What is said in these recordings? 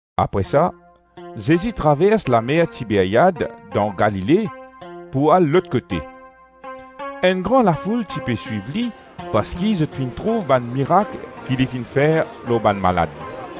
Apre sa, Zezi travers lamer Tiberiad dan Galile pou al lot kote. Enn gran lafoul ti pe swiv li parski zot finn trouv bann mirak ki li finn fer lor bann malad.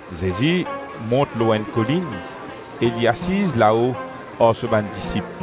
Zezi mont lor enn kolinn e li asiz lao ar so bann disip.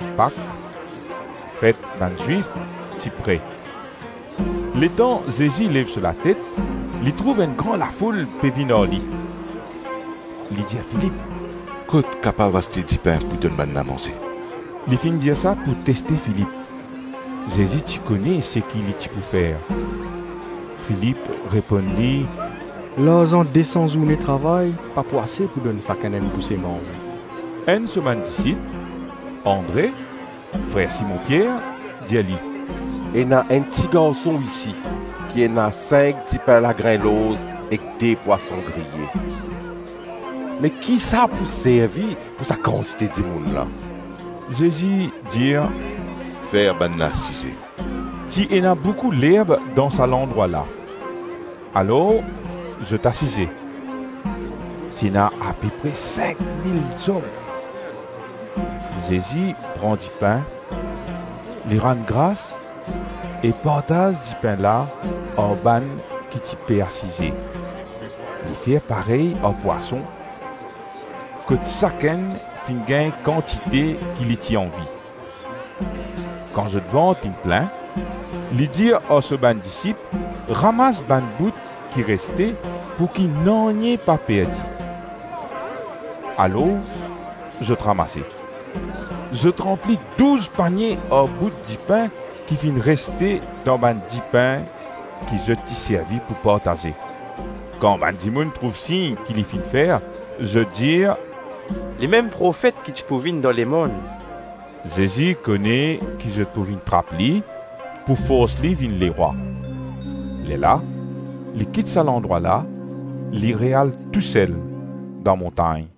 Pak, fet bann Zwif, ti pre. Letan Zezi lev so latet, li trouv enn gran lafoul pe vinn ar li. Li dir Filip, “Kot kapav aste dipin pou donn bannla manze?” Li finn dir sa pou teste Filip. Zezi ti kone seki li ti pou fer. Filip reponn li, “Larzan de san zourne travay pa pou ase pou donn sakenn enn bouse manze.” Enn so bann disip, Andre, frer Simon Pier, dir li, “Ena enn tigarson isi ki ena sink dipin lagrin lorz ek de pwason griye; me ki sa pou servi pou sa kantite dimoun la?” Zezi dir, “Fer bannla asize.” Ti ena boukou lerb dan sa landrwa la. Alor zot asize; ti ena apepre sink mil zom. Zezi pran dipin, li rann gras e partaz dipin la ar bann ki ti pe asize; li fer parey ar pwason, kot sakenn finn gagn kantite ki li ti anvi. Kan zot vant inn plin, li dir ar so bann disip ramas bann bout ki reste pouki nanye pa perdi. Alors zot ramase. Zot ranpli douz panie ar bout dipin ki finn reste dan bann dipin ki zot ti servi pou partaze. Kan bann dimoun trouv sign ki li finn fer, zot dir, “Limem Profet ki ti pou vinn dan lemonn.” Zezi kone ki zot pou vinn trap li, pou fors li vinn lerwa; lerla li kit sa landrwa la, li re-al tousel dan montagn.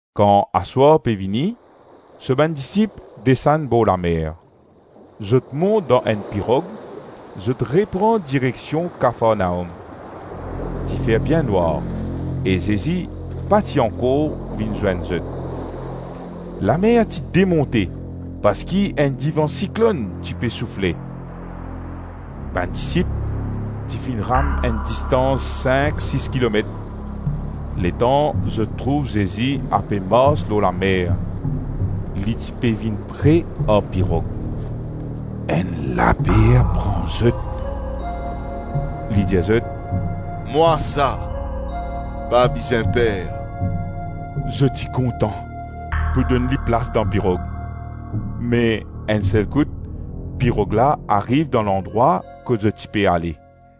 Kan aswar pe vini, so bann disip desann borlamer. Zot mont dan enn pirog, zot repran direksion Kafarnaom. Ti fer bien nwar e Zezi pa ti ankor vinn zwenn zot. Lamer ti demonte parski enn divan siklonn ti ape soufle. Bann disip ti finn ram enn distans sink-sis kilomet, letan zot trouv Zezi ape mars lor lamer; li ti pe vinn pre ar pirog. Enn laper pran zot. Li dir zot, “Mwa sa, pa bizin per.” Zot ti kontan pou donn li plas dan pirog, me enn sel kout pirog la ariv dan landrwa kot zot ti pe ale.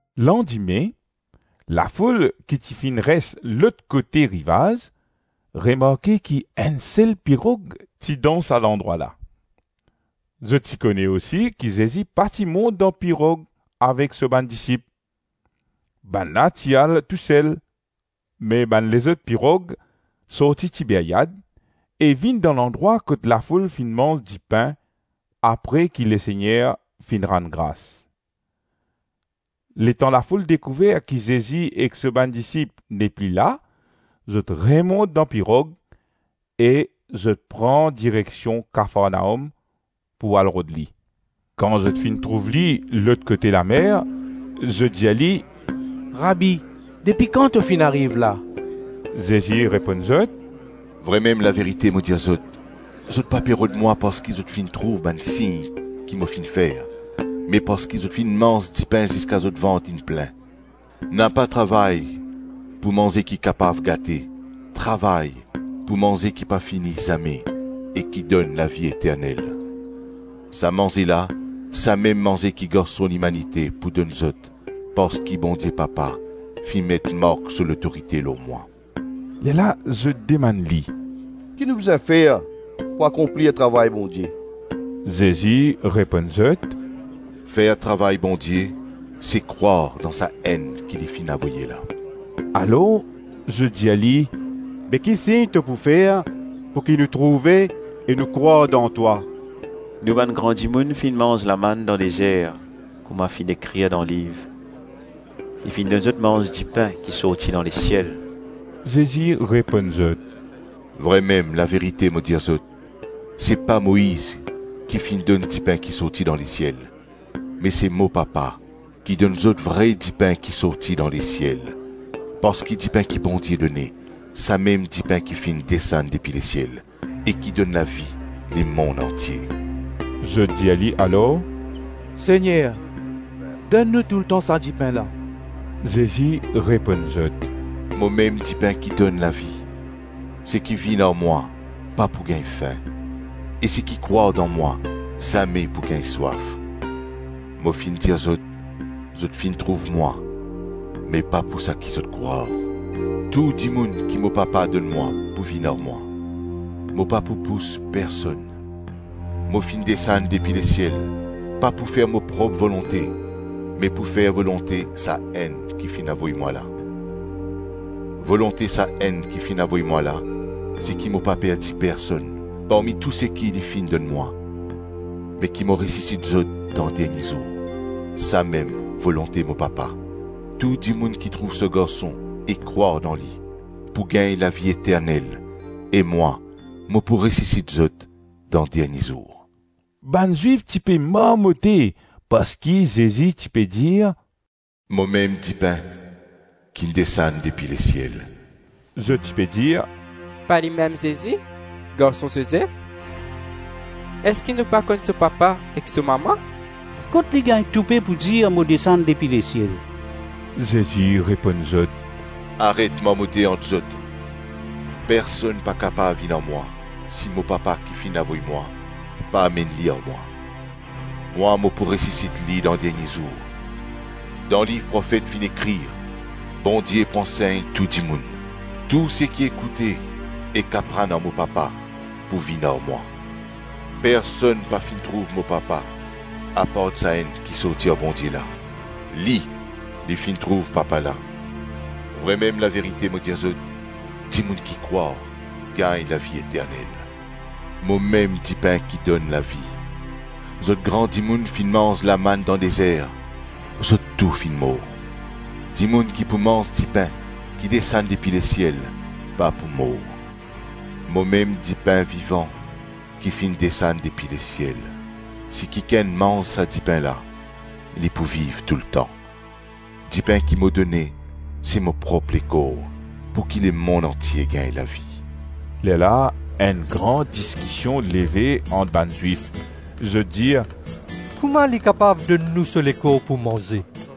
Landime, lafoul ki ti finn res lot kote rivaz, remarke ki enn sel pirog ti dan sa landrwa la. Zot ti kone osi ki Zezi pa ti mont dan pirog avek so bann disip; bannla ti al tou sel. Me bann lezot pirog sorti Tiberiad e vinn dan landrwa kot lafoul finn manz dipin apre ki Lesegner finn rann gras. Letan lafoul dekouver ki Zezi ek so bann disip nepli la, zot remont dan pirog e zot pran direksion Kafarnaom pou al rod li. Kan zot finn trouv li lot kote lamer, zot dir li, “Rabi, depi kan to finn ariv la?” Zezi reponn zot, “Vremem laverite mo dir zot, zot pa pe rod mwa parski zo finn trouv bann sign ki mo finn fer, me parski zot finn manz dipin ziska zot vant inn plin. Napa travay pou manze ki kapav gate, travay pou manze ki pa fini zame e ki donn lavi eternel. Sa manze la, samem manze ki Garson Limanite pou donn zot parski Bondie Papa finn met mark so lotorite lor mwa.” Lerla zot demann li, “Ki nou bizin fer pou akonplir travay Bondie?” Zezi reponn zot, “Fer travay Bondie, se krwar dan Sa-Enn ki li finn avoye la.” Alors zot dir li, “Be, ki sign to pou fer, pouki nou trouve e nou krwar dan twa? Nou bann gran dimoun finn manz lamann dan dezer kouma finn ekrir dan liv, li finn donn zot manz dipin ki sorti dan lesiel.” Zezi reponn zot, “Vremem laverite mo dir zot, se pa Moiz ki finn donn dipin ki sorti dan lesiel, me se mo Papa ki donn zot vre dipin ki sorti dan lesiel. Parski dipin ki Bondie done, samem dipin ki finn desann depi lesiel e ki donn lavi lemonn antie.” Zot dir li alor, “Segner, donn nou toultan sa dipin la.” Zezi reponn zot, “Momem dipin ki donn lavi; seki vinn ar mwa pa pou gagn fin e seki krwar dan mwa zame pou gagn swaf. Mo finn dir zot: zot finn trouv mwa, me pa pou sa ki zot krwar. Tou dimoun ki mo Papa donn mwa pou vinn ar mwa; mo pa pou pous personn. Mo finn desann depi lesiel pa pou fer mo prop volonte me pou fer volonte Sa-Enn ki finn avoy mwa la. Volonte Sa-Enn ki finn avoy mwa la, se ki mo pa perdi personn parmi tou seki li finn donn mwa, me ki mo resisit zot dan dernie zour. Samem volonte mo Papa: tou dimoun ki trouv so Garson e krwar dan li, pou gagn lavi eternel, e mwa mo pou resisit zot dan dernie zour.” Bann Zwif ti pe marmote parski Zezi ti pe dir, “Momem dipin kinn desann depi lesiel.” Zot ti pe dir, “Pa limem Zezi, garson Zozef? Eski nou pa konn so papa ek so mama? Kot li gagn toupe pou dir mo desann depi lesiel?” Zezi reponn zot, “Aret marmote ant zot. Personn pa kapav vinn ar mwa, si mo Papa ki finn avoy mwa pa amenn li ar mwa; mwa mo pou resisit li dan dernie zour. Dan liv profet finn ekrir, ‘Bondie pou ansegn tou dimoun.’ Tou seki ekoute ek aprann ar mo Papa, pou vinn ar mwa. Personn pa finn trouv mo Papa apart Sa-Enn ki sorti ar Bondie la; Li, li finn trouv Papa la. Vremem laverite mo dir zot, dimoun ki krwar, gagn lavi eternel. Momem dipin ki donn lavi. Zot gran dimoun finn manz lamann dan dezer, zot tou finn mor. Dimoun ki pou manz dipin ki desann depi lesiel pa pou mor. Momem dipin vivan ki finn desann depi lesiel; si kikenn manz sa dipin la, li pou viv toultan; dipin ki mo done, se mo prop lekor pouki lemonn antie gagn lavi.” Lerla enn gran diskision leve ant bann Zwif; zot dir, “Kouma li kapav donn nou so lekor pou manze?”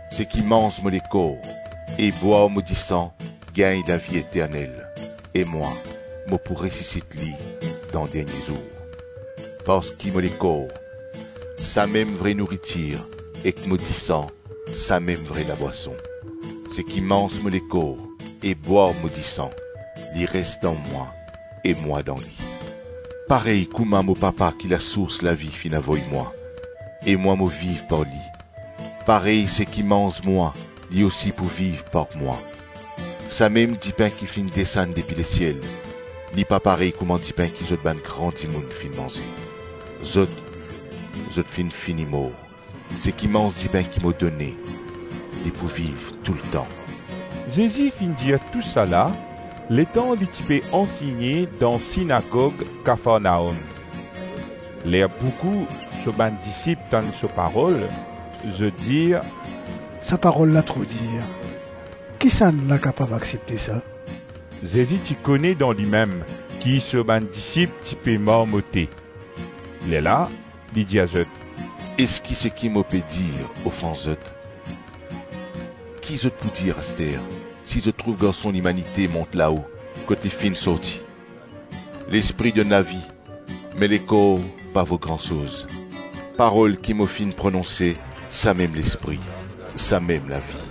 Seki manz mo lekor e bwar mo disan gagn lavi eternel, e mwa, mo pou resisit li dan dernie zour. Parski mo lekor, samem vre nouritir ek mo disan, samem vre labwason. Seki manz mo lekor e bwar mo disan, li res dan mwa e mwa dan li. Parey kouma mo Papa ki lasours lavi finn avoy mwa, e mwa mo viv par li, parey seki manz mwa, li osi pou viv par mwa. Samem dipin ki finn desann depi lesiel; li pa parey kouma dipin ki zot bann gran dimoun finn manze. Zot, zot finn fini mor; seki manz dipin ki mo done, li pou viv toultan.” Zezi finn dir tou sa la, letan li ti pe ansegne dan sinagog Kafarnaom. Ler boukou so bann disip tann so parol, zot dir, “Sa parol la tro dir; kisannla kapav aksepte sa?” Zezi ti kone dan limem ki so bann disip ti pe marmote; lerla li dir zot, “Eski seki mo pe dir ofans zot? Ki zot pou dir aster, si zot trouv Garson Limanite mont lao kot li finn sorti? Lespri donn lavi me lekor pa vo gran soz; parol ki mo finn prononse, samem Lespri, samem lavi.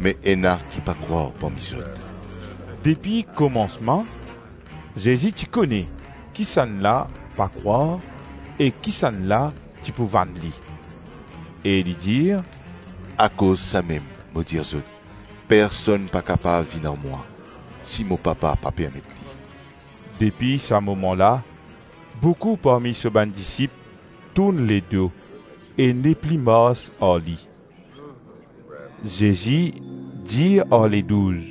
Me ena ki pa krwar parmi zot.” Depi komansman, Zezi ti kone kisannla pa krwar e kisannla ti pou vann li. E li dir, “Akoz samem, mo dir zot, personn pa kapav vinn ar mwa, si mo Papa pa permet li.” Depi sa moman la, boukou parmi so bann disip tourn ledo e nepli mars ar li. Zezi dir ar Ledouz,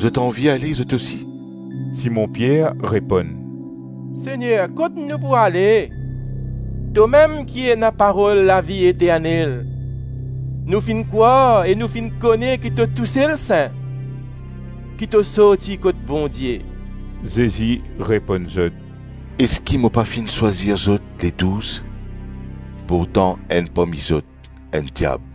“Zot anvi ale zot osi?” Simon Pier reponn, “Segner, kot nou pou ale? Tomem ki ena parol lavi eternel. Nou finn krwar e nou finn kone ki to tousel Sin, ki to sorti kot Bondie.” Zezi reponn zot, “Eski mo pa finn swazir zot Ledouz? Pourtan enn parmi zot enn diab.”